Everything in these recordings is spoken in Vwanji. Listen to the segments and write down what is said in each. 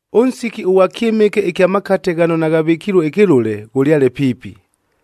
Ʉnsiki ʉghwa kyɨmɨke ɨkya makate ghano naghavɨkilue ɨkɨlʉle, ghʉlyale piipi,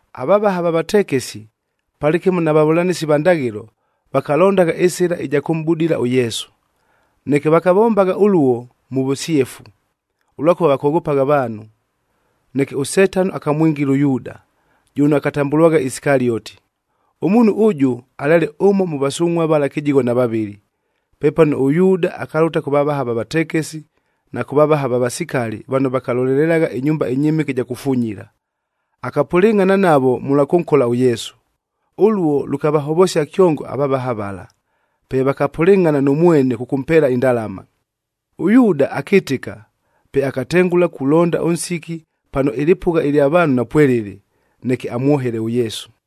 Avavaha va vatekesi, palɨkɨmo na vavʉlanɨsi va ndaghɨlo, vakalondagha ɨsɨla ɨja kʉmʼbudila ʉYesu. Neke vakavombagha ʉluo mʉ vʉsyefu, ʉlwakʉva vakoghopagha avaanhu. Neke ʉSetano akamwingila ʉYuuda, jʉno akatambʉlwagha Isikalioti. Ʉmuunhu ʉjʉ alyale ʉmo mʉ vasungʼhua vala kɨjigho na vavɨlɨ. Pepano ʉYuuda akalʉta kʉ vavaha va vatekesi, na kʉ vavaha va vasikali vano vakalolelelagha ɨnyumba ɨnyɨmɨke ɨja kufunyila. Akapʉlɨngʼhana navo mʉlwa kʉnkola ʉYesu. Ʉluo, lʉkavahovosia kyongo avavaha vala, pe vakapʉlɨngʼhana nʉ mwene kʉkʉmpeela indalama. ɄYuuda akɨtɨka, pe akatengʉla kulonda ʉnsiki pano ɨlɨpʉgha ɨlya vaanhu napwelɨlɨ, neke amwohele ʉYesu.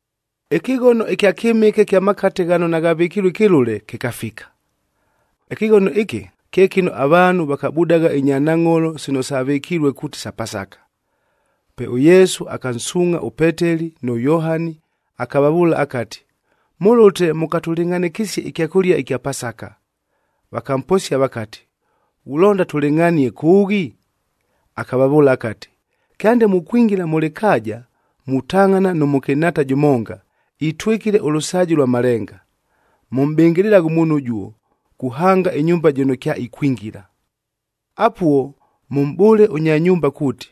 Ɨkɨghono ɨkya kyɨmɨke kya makate ghano naghavɨkilue ɨkɨlʉle, kɨkafika. Ɨkɨghono ɨkɨ, kye kɨno avaanhu vakabudagha inyanangʼholo sino savɨkilue kuuti sa Pasaka. Pe ʉYesu akansuungʼha ʉPeteli nʉ Yohani, akavavʉʉla akati, “Mʉlʉte mʉkatʉlɨngʼhanɨkɨsie ɨkyakʉlia ɨkya Pasaka.” Vakamposia vakati, “Ghulonda tʉlɨngʼhanie kʉʉghi?” Akavavʉʉla akati, “Kyande mukwingila mʉ lɨkaaja,b mutangʼhana nʉ mʉkɨnhaata jʉmonga, itwɨkile ʉlʉsaaji lwa malenga. Mʉmʼbɨngɨlɨlaghe ʉmuunhu ʉjuo, kuhanga ɨnyumba jɨno kyaikwingila. Apuo, mʉmʼbʉʉle ʉnya nyumba kuuti,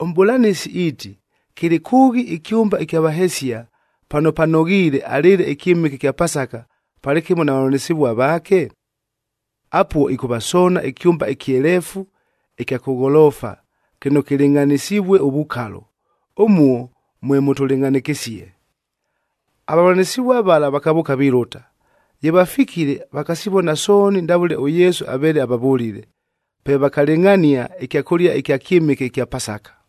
‘ɄMʼbʉlanɨsi iiti, kɨlɨ kʉʉghi ɨkyʉmba ɨkya vahesia, pano panoghiile alɨɨle ɨkyɨmɨke ɨkya Pasaka, palɨkɨmo na vavʉlanɨsɨvua vaake?’ Apuo, ɨkʉvasoona ɨkyʉmba ɨkyeleefu ɨkya kʉ gholoofa, kɨno kɨlɨngʼhanɨsivue ʉvukalo. Ʉmuo mwe mʉtʉlɨngʼhanɨkɨsie.” Avavʉlanɨsɨvua vala vakavʉʉka vilʉta. Ye vafikile, vakasivona sooni ndavʉle ʉYesu aveele avavʉlile. Pe vakalɨngʼhania ɨkyakʉlia ɨkya kyɨmɨke ɨkya Pasaka.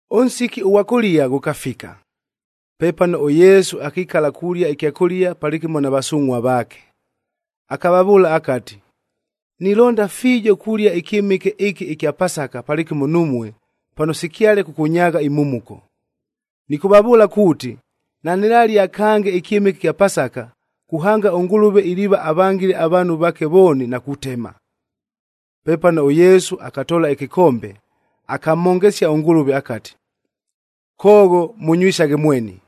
Ʉnsiki ʉghwa kʉlia ghʉkafika. Pepano ʉYesu akikala kulia ɨkyakʉlia palɨkɨmo na vasungʼhua vaake. Akavavʉʉla akati, “Nilonda fiijo kulia ɨkyɨmɨke ɨkɨ ɨkya Pasaka palɨkɨmo numue, pano sikyale kʉkʉnyaagha imhumuko. Nɨkʉvavʉʉla kuuti, nanɨlalia kange ɨkyɨmɨke ɨkya Pasaka, kuhanga ʉNgʉlʉve iliiva avangile avaanhu vaake vooni na kutema.” Pepano ʉYesu akatoola ɨkɨkombe, akamhongesia ʉNgʉlʉve akati, “Koogho, mʉnywisaghe mweni!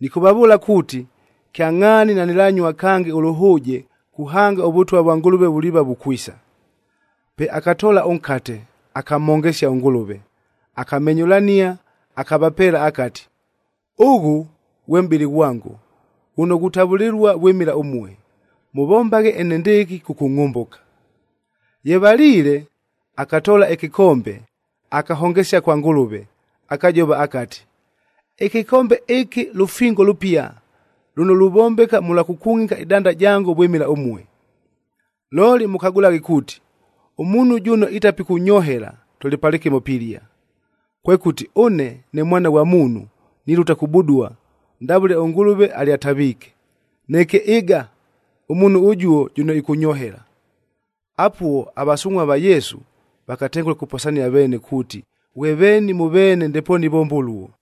Nɨkʉvavʉʉla kuuti, kyangʼhaani nanɨlanyua kange ʉlʉhʉʉje kuhanga ʉVʉtwa vwa Ngʉlʉve vuliiva vukwisa.” Pe akatoola ʉnkate, akamhongesia ʉNgʉlʉve, akamenyʉlania, akavapeela, akati, “Ʉghʉ, ghwe mʼbɨlɨ ghwango, ghʉno ghutavʉlɨlua vwɨmɨla ʉmue. Mʉvombaghe enendɨɨkɨ, kʉkʉngʼhʉmbʉka.” Ye valiile, akatoola ɨkɨkombe akahongesia kwa Ngʉlʉve. Akajova akati, “Ɨkɨkombe ɨkɨ lʉfingo lʉpia, lʉno luvombeka mʉlwa kʉkungʼika ɨdanda jango vwɨmɨla ʉmue. “Looli mʉkagʉlaghe kuuti, ʉmuunhu jʉno itapikʉnyohela, tʉlɨ palɨkɨmo pilia. Kwekʉti, ʉne ne Mwana ghwa Muunhu nilʉta kubudua, ndavʉle ʉNgʉlʉve alyataviike. Neke ɨga, ʉmuunhu ʉjuo jʉno ɨkʉnyohela!” Apuo, avasungʼhua va Yesu vakatengʉla kuposania veene kuuti, ghwe veeni mʉ veene ndepoonu ivomba ʉluo.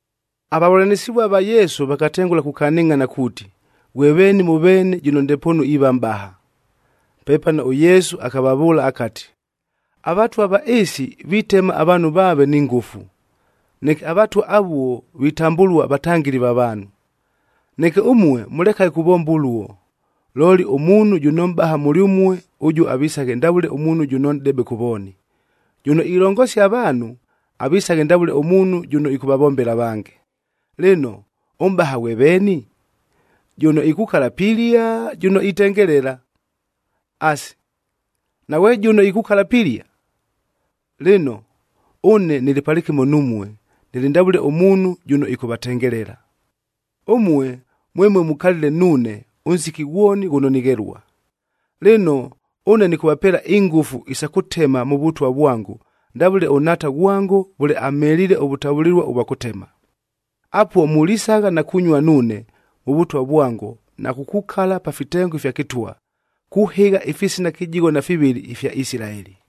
Avavʉlanɨsɨvua va Yesu vakatengʉla kukanɨngʼhana kuuti, ghwe veeni mʉ veene jʉno ndepoonu iiva mʼbaha. Pepano ʉYesu akavavʉʉla akati, “Avatwa va ɨɨsi, vitema avaanhu vaave ni ngʉfu, neke avatwa avuo vitambʉlua vatangɨli va vaanhu. “Neke ʉmue, mʉlekaghe kuvomba ʉluo. Looli ʉmuunhu jʉno mʼbaha mʉlyʉmue, ʉjuo avisaghe ndavʉle ʉmuunhu jʉno nʼdebe kʉ vooni. Jʉno ilongosia avaanhu, avisaghe ndavʉle ʉmuunhu jʉno ɨkʉvavombela avange. Lɨno, ʉmʼbaha ghwe veeni? Jʉno ikukala pilia! Jʉno itengelela? Asi, naghwe jʉno ikukala pilia? Lɨno, ʉne nɨlɨ palɨkɨmo numue, nɨlɨ ndavʉle ʉmuunhu jʉno ɨkʉvatengelela. “Ʉmue mwemue mukalile nuune, ʉnsiki ghwoni ghʉno nighelua. Lɨno, ʉne nɨkʉvapeela ingʉfu isa kʉtema mʉ Vʉtwa vwango, ndavʉle ʉNhaata ghwango vʉle amheliile ʉvʉtavʉlɨlua ʉvwa kʉtema. Apuo mulisagha na kunyua nuune, mʉ Vʉtwa vwango na kukukala pa fitengo ifya kɨtwa, kuhɨgha ifisina kɨjigho na fivɨlɨ ifya Isilaeli.”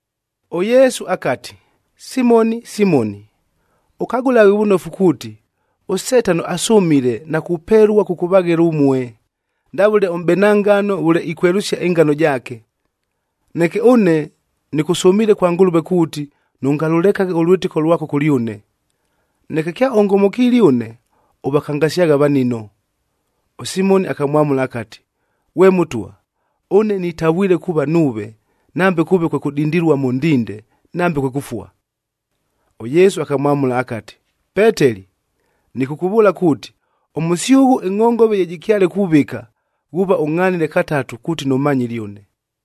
ɄYesu akati, “Simoni, Simoni! Ʉkagʉlaghe vʉnofu kuuti, ʉSetano asʉmile na kupelua kʉkʉvaghela ʉmue, ndavʉle ʉmʼbena ngano vʉle ikwelʉsia ɨngano jaake. Neke ʉne, nɨkʉsʉmiile kwa Ngʉlʉve kuuti, nʉngalʉlekaghe ʉlwɨtɨko lwako kʉlyʉne. Neke kyaʉngomokiile ʉne, ʉvakangasyaghe avanino.” ɄSimoni akamwamʉla akati, “Ghwe Mʉtwa! Ʉne nitavwile kuuva nuuve, nambe kʉʉve kwe kʉdindilua mʉ ndinde, nambe kwe kʉfua!” ɄYesu akamwamʉla akati, “Peteli! Nɨkʉkʉvʉʉla kuuti, ʉmʉsyʉghʉ ɨngʼhongove ye jɨkyale kuvɨka, ghuuva ʉngʼhanile katatu kuuti nʉmanyile ʉne.”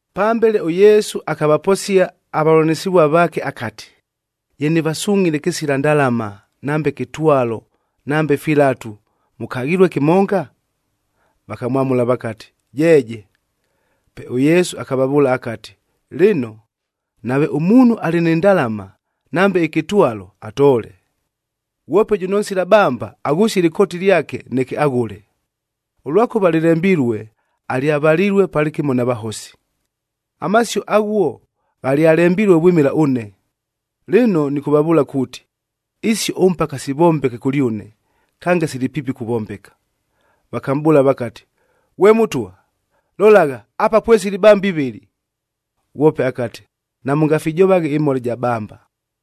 Pambele ʉYesu akavaposia avavʉlanɨsɨvua vaake akati, “Ye nɨvasungʼhile kɨsila ndalama, nambe kɨtwalo nambe filatu, mʉkaghilue kɨmonga?” Vakamwamʉla vakati, “Jeeje.” Pe ʉYesu akavavʉʉla akati, “Lɨno, nave ʉmuunhu alɨ ni ndalama, nambe ɨkɨtwalo, atoole. Ghwope jʉno nsila bamba, aghʉsie ɨlɨkooti lyake, neke aghʉle. Ʉlwakʉva lɨlembilue, ‘Alyavalilue palɨkɨmo na vahosi.’c Amasio aghuo ghalyalembilue vwɨmɨla ʉne. Lɨno nɨkʉvavʉʉla kuuti, isio ʉmpaka sivombeke kʉlyʉne, kange sili piipi kuvombeka.” Vakamʼbʉʉla vakati, “Ghwe Mʉtwa! Lolagha, apa pwesili ibamba ivɨlɨ.” Ghwope akati, “Namʉngafijovaghe ɨmhola ɨja bamba.”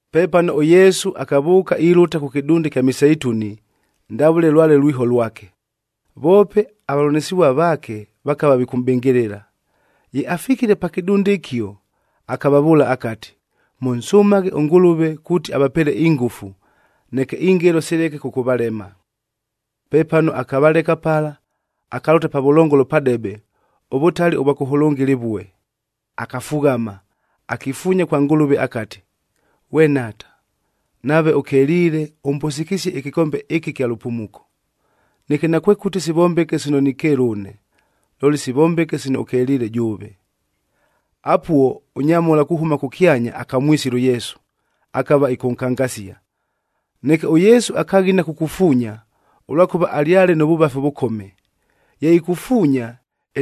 Pepano ʉYesu akavʉʉka ilʉta kʉ kɨdunda ɨkya Miseituni, ndavʉle lwale lwiho lwake. Voope avavʉlanɨsɨvua vaake, vakava vikʉmʼbɨngɨlɨla. Ye afikile pa kɨdunda ɨkio, akavavʉʉla akati, “Mʉnsʉmaghe ʉNgʉlʉve kuuti avapeele ingʉfu, neke ingelo sileke kʉkʉvalema.” Pepano, akavaleka pala, akalʉta pavʉlongolo padebe, ʉvʉtali ʉvwa kʉhʉlʉnga ɨlɨvue. Akafughama, akifuunya kwa Ngʉlʉve akati, “Ghwe Nhaata! Nave ʉkeliile, ʉmbʉsɨkɨsie ɨkɨkombe ɨkɨ ɨkya lʉpumuko. Neke, nakwekʉti sivombeke sino nikeela ʉne, looli sivombeke sino ʉkeliile jʉʉve!” Apuo, ʉnyamhola kuhʉma kʉkyanya akamwisila ʉYesu, akava ɨkʉnkangasia. Neke ʉYesu akaghina kukufuunya, ʉlwakʉva alyale nʉ vʉvafi ʉvʉkome. Ye ikufuunya,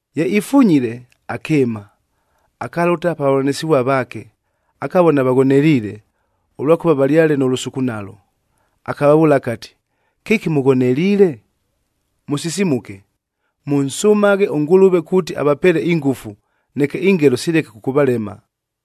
Ye ifunyile, akɨɨma, akalʉta pa vavʉlanɨsɨvua vaake, akavona vaghoneliile, ʉlwakʉva valyale nʉ lʉsukunalo. Akavavʉʉla akati, “Kɨki mʉghoneliile? Mʉsisimuke! Mʉnsʉmaghe ʉNgʉlʉve kuuti avapeele ingʉfu, neke ingelo sileke kʉkʉvalema.”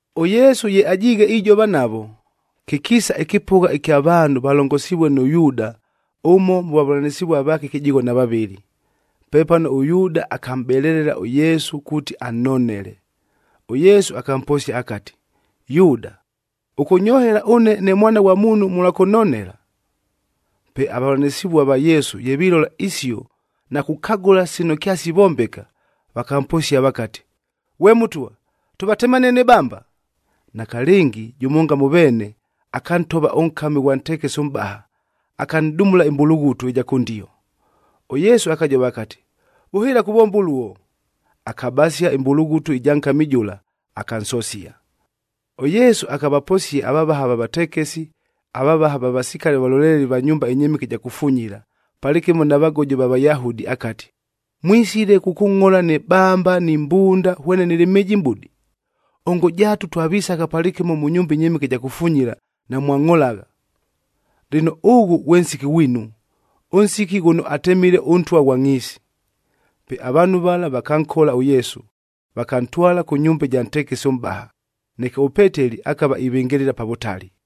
ɄYesu ye ajiighe ijova navo, kɨkiisa ɨkɨpʉgha ɨkya vaanhu valongosivue nʉ Yuuda, ʉmo mʉ vavʉlanɨsɨvua vaake kɨjigho na vavɨlɨ. Pepano ʉYuuda akamʼbelelela ʉYesu kuuti annonele. ɄYesu akamposia akati, “Yuuda! Ʉkʉnyohela ʉne ne Mwana ghwa Muunhu mʉlwa kʉnonela?” Pe avavʉlanɨsɨvua va Yesu ye vilola isio na kukagʉla sino kyasivombeka, vakamposia vakati, “Ghwe Mʉtwa! Tʉvatemanie ni bamba?” Nakalɨngi, jʉmonga mʉ veene akantova ʉnkami ʉghwa ntekesi ʉmʼbaha, akanʼdumula ɨmbulughutu ɨja kʉndio. ɄYesu akajova akati, “Vʉhɨɨla kuvomba ʉluo!” Akabasia ɨmbulughutu ɨja nkami jʉla, akansosia. ɄYesu akavaposia avavaha va vatekesi, avavaha va vasikali avalolelelie va nyumba ɨnyɨmɨke ɨja kufunyila, palɨkɨmo na vagojo va Vayahudi akati, “Mwisile kʉkʉngʼhola ni bamba ni mbunda hwene nɨlɨ mhɨjimʼbudi? Ongo jaatu, twavisagha palɨkɨmo mʉ nyumba ɨnyɨmɨke ɨja kufunyila, namwangʼholagha! Lɨno, ʉghʉ ghwe nsiki ghwinu, ʉnsiki ghʉno atemile ʉntwa ghwa ngʼhiisi.” Pe avaanhu vala vakankola ʉYesu, vakantwala kʉ nyumba ɨja ntekesi ʉmʼbaha.f Neke ʉPeteli akava ivɨngɨlɨla pa vʉtali.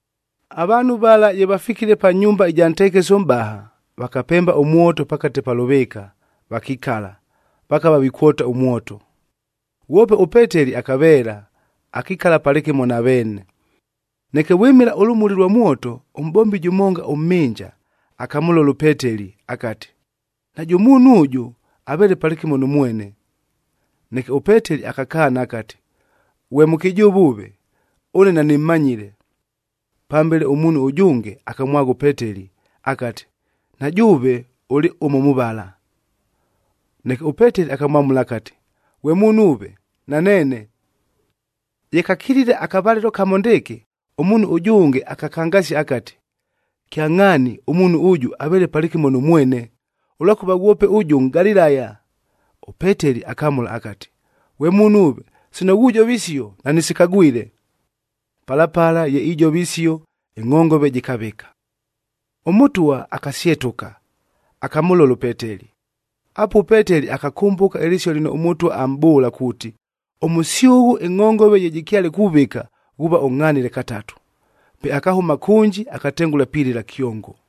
Avaanhu vala ye vafikile pa nyumba ɨja ntekesi ʉmʼbaha, vakapemba ʉmwoto pakate pa lʉvɨɨka, vakikala, vakava vikwota ʉmwoto. Ghwope ʉPeteli akaveela, akikala palɨkɨmo na veene. Neke vwɨmɨla ʉlʉmuli lwa mwoto, ʉmʼbombi jʉmonga ʉmhɨnja, akamʉlola ʉPeteli akati, “Najʉ muunhu ʉjʉ, aveele palɨkɨmo nʉ mwene.” Neke ʉPeteli akakaana akati, “Ghwe mʉkɨjʉʉva ʉve! Ʉne nanɨmmanyile!” Pambele, ʉmuunhu ʉjʉnge akamwagha ʉPeteli akati, “Na jʉʉve ʉlɨ ʉmo mʉ vala.” Neke ʉPeteli akamwamʉla akati, “Ghwe muunhu ʉve! Naneene!” Ye kakilile akavalɨlo kamo ndɨɨkɨ, ʉmuunhu ʉjʉnge akakangasia akati, “Kyangʼhaani, ʉmuunhu ʉjʉ aveele palɨkɨmo nʉ mwene! Ʉlwakʉva ghwope ʉjʉ Nʼgalilaya!” ɄPeteli akamʉla akati, “Ghwe muunhu ʉve! Sino ghujova isio, nanɨsikagwile!” Pala pala ye ijova isio, ɨngʼhongove jɨkavɨka. ɄMʉtwa akasyetʉka, akamʉlola ʉPeteli. Apuo ʉPeteli akakʉmbʉka ɨlɨsio lɨno ʉMʉtwa amʼbʉʉla kuuti, “Ʉmʉsyʉghʉ, ɨngʼhongove ye jɨkyale kuvɨka, ghuuva ʉngʼhanile katatu.” Pe akahʉma kʉnji, akatengʉla pilɨla kyongo.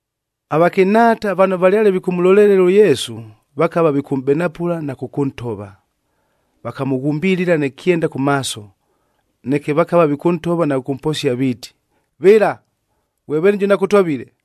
Avakɨnhaata vano valyale vikʉmʉlolelela ʉYesu, vakava vikʉmʼbenapʉla na kʉkʉntova. Vakamʉghumbilila nɨ kyenda kʉ maaso, neke vakava vikʉntova na kʉkʉmposia viiti, “Vɨla! Ghwe veeni jʉno akʉtovile?”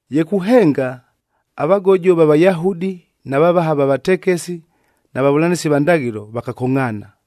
Ye kuhenga, avagojo va Vayahudi, na vavaha va vatekesi, na vavʉlanɨsi va ndaghɨlo, vakakongʼhaana.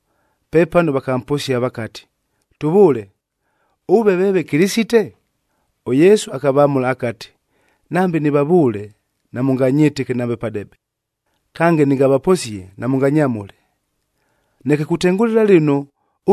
Pepano vakamposia vakati, “Tʉvʉʉle! Ʉve veeve Kɨlɨsite?” ɄYesu akavamʉla akati, “Nambe nɨvavʉʉle, namʉnganyɨtɨke nambe padebe. Kange nɨngavaposie, namʉnganyamʉle. Neke kutengʉlɨla lɨno,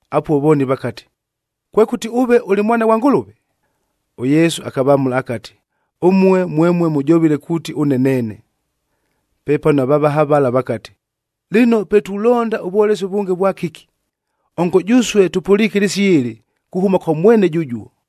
Apuo vooni vakati, “Kwekʉti ʉve ʉlɨ Mwana ghwa Ngʉlʉve?” ɄYesu akavamʉla akati, “Ʉmue mwemue mʉjovile kuuti ʉne neene!” Pepano avavaha vala vakati, “Lɨno pe tulonda ʉvwolesi ʉvʉnge vwakɨki? Ongo jʉsue tʉpʉliike ɨlɨsio ɨlɨ, kuhʉma kwa mwene jʉjuo!”